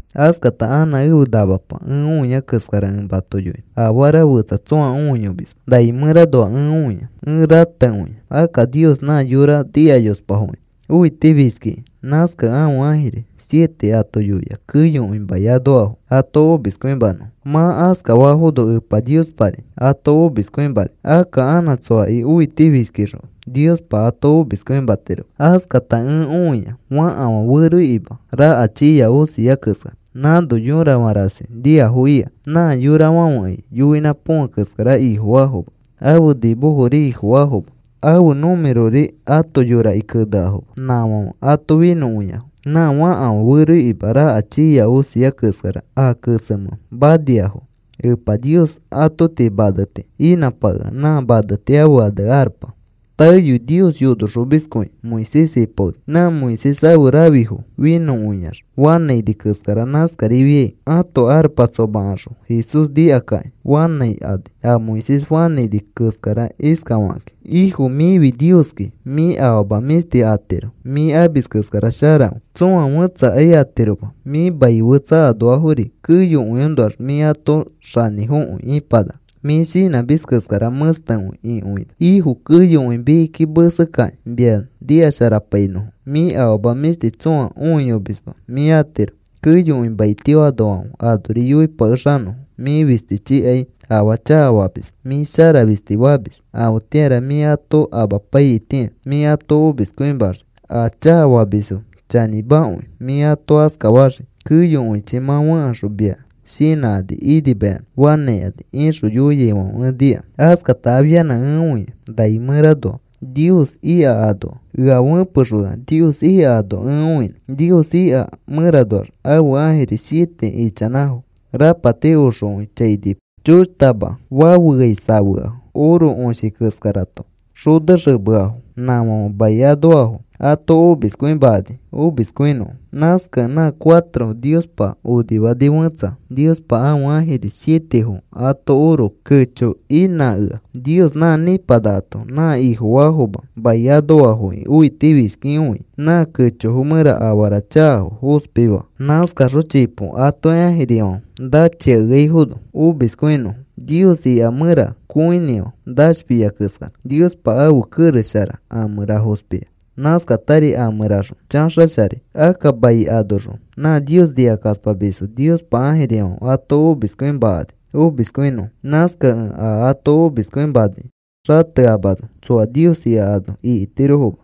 Askata anã ẽfe namapa ẽ õia keskara ẽ mato yoinõ. Afara fetsa tsõa õiyomisma nai mẽranoa ẽ õia. Ẽ ratekõia. Akka Nios nã yora nikayospafoki õitifishkiki. Nãskakẽ ãfe ãjiri siete ato yoia keyokõi mai anoafo ato omiskõimanõfo. Mã askafafono Epa Niospari ato omiskõimani. Akka anã tsoaki õitifishkixõ, Niospa ato omiskõimatiroma. Askata ẽ õia fakafã feroikima raka chiiya osia keskara. Nãno yorafã rasi niafo ika. Nã yorafãfekai yoinã põfe keskara ifofaafoma; ãfe nimofori ifofaafoma; ãfe numerori ãto yoraki keneafoma. Nãfãfe ato finõkõiafo. Nã fakafã feroikima raka chiiya osia keskara a kesemẽ maniafo. Epa Nios ato tii maneti inãpakea. Nã maneti ãfe ane arpa. Taeyoi Nios yonoxomiskõi Moisés ipaoni. Nã Moisés ãfe rãfifo finõkõiax fanãini keskara nãskarifiai ãto arpa tsomakaxõ Jesús shinãkakĩ fanãikani a Moisés fanãini keskara iskafakakĩ: Ifo, mĩfi Nioski. Mĩ afama mĩshti atiro. Mĩ amis keskara sharakõi. Tsoa fẽtsakai atiroma. Mĩ mai fetsa anoafori keyokõiõnoax mĩ ãto xanĩfokõi ipanaka. Mĩ shinãmis keskara mẽstekõi ikõina. Ifo, keyokõi mikiki mesekakĩ mia nikasharapainõfo. Mĩ afama mĩshti tsõa õiyomisma mĩ atiro. Keyokõi maitio anoafãfe anori yoipakexanõfo. Mĩ fistichikai afaa chakafamisma. Mĩ shara fisti famis. Afetĩara mĩ ato apaiyaitĩa mĩ ato omiskõimaxii a chakafamisfo. Chanĩmakõi mĩ ato askafaxii. Keyokõichi mã fẽkaxõ mia shinãkani inimayanã fanãikani, ixõ yoiaifãfe ẽ nika. Askata afianã ẽ õia nai mẽranoa Nios ika anoa. Ea fẽpexona Nios ika ano ẽ õinõ. Nios ika mẽranoax ãfe ãjiri siete ichanãfo. Rapati oxokõi chainipa choshtama fafeai safeafo, oro õshi keskarato xonexemeafo. Nãfãfe mai anoafo ato omiskõimakani omiskõinõfo. Nãskakẽ nã cuatro Niospa onifaa fẽtsa Niospa ãfe ãjiri sietefo ato oro kecho inãakea. Nios nã nipanakato nã Ifofaafoma mai anoafoki õitifishkikõikĩ nã kechofo mẽra afara chakafo fospi faa nãskaxõ chipo atoki ãjirifãfe nachiakeaifono omiskõinofo. Nios ika mẽra kõinĩfã nashfiai keskara. Niospa ãfe kerex shara a mẽra fospia. Nãskatari a mẽraxõ chaxasharai. Akka mai anoxõ nã Nios nikakaspamisfo Niospa ãjirifãfe ato omiskõimakani omiskõinõfo. Nãskakẽ a ato omiskõimanai xateamano tsoa Nios ika ano ikitirofoma.